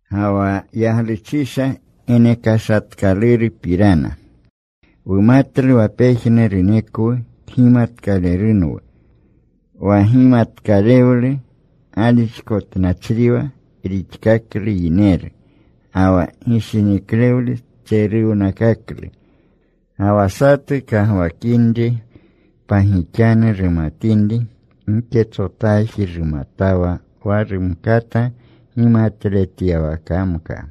Ga wa yagluchisha genekashatkalurupirana, wumatlu wa pejnurunekwu kgimatkalerunwu. Wa gimatkalewlu galixkotnachriwa rixkaklu yineru. Ga wa gishiniklewlu tseruwnakaklu. Ga wa satu kagwakinri pagixanu rumatinri, giketsotaji rumatawa wa rumkata gimatletyawakamka.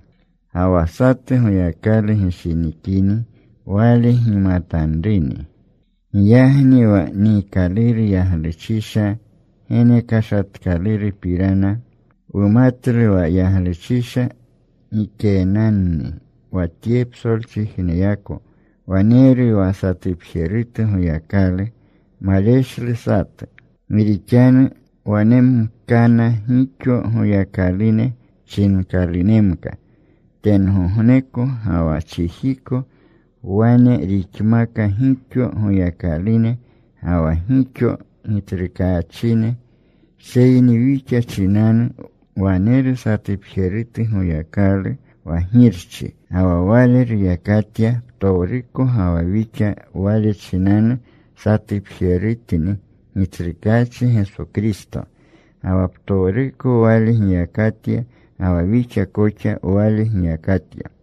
Ga wa satu Goyakalu gishinikini, Wale gimatanruni. Giyagni wa niikaluru yagluchisha genekashatkalurupirana, wumatlu wa yagluchisha gikenanni wa tye psolchijneyako. Waneru wa satupjerutu Goyakalu. Maleshlu satu. Gi rixanu wanemkana gixo goyakalune chinkalunemka tengogneko ga wa chijiko. Wane rixmaka gixo goyakalune ga wa gixo gitsrukaachine. Seyni wixa chinanu waneru satupjerutu Goyakalu, wa Girchi. Ga wa Wale ruyakatya ptowruko, ga wa wixa Wale chinanu. Satupjerutni Gitsrukaachi Geso Kristo, ga wa ptowruko Wale giyakatya, ga wa wixa koxa Wale giyakatya.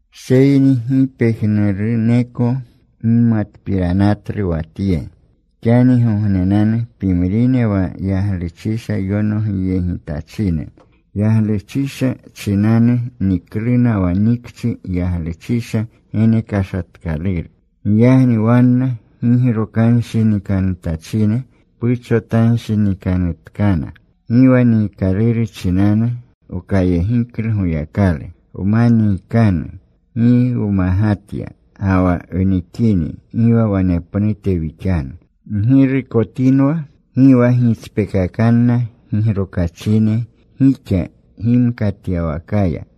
Seyni gi pejnuruneko gimatpiranatlu wa tye. Xanigognenanu pimrine wa yagluchisha yonogyegjetachine, yagluchisha chinanu nikluna wa nikchi yagluchisha genekashatkaluru. Giyagni wanna gigrokanshinikanutachine puchotanshinikanutkana. Gi wa niikaluru chinanu wkayegiklu Goyakalu. Wma niikanu, gi wmagatya. Ga wa wnikini gi wa wanepnute wixanu. Ggirukotinwa. Gi wa gitspekakanna gigrokachine gixa gimkatyawakaya.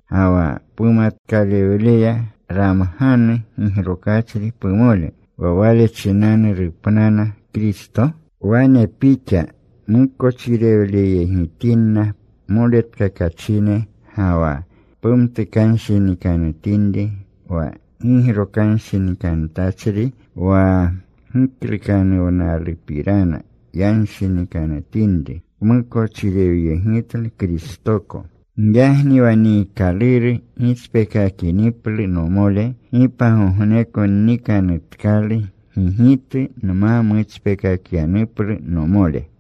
ga wa pumatkalewleya ramganu gigrokachri pumole, wa wale chinanu rupnana Kristo? Wane pixa mukochirewleyegitinna moletkakachine, ga wa pumtukanshinikanutinri wa gigrokanshinikanutachri wa giklukanuwnalupirana yanshinikanutinri, pmukochirewyegitlu Kristoko. Giyagni wa niikaluru gitspeekakiniplu nomole, gi pagogneko nnikanutkalu gigitu nma mutspekakyanuplu nomole.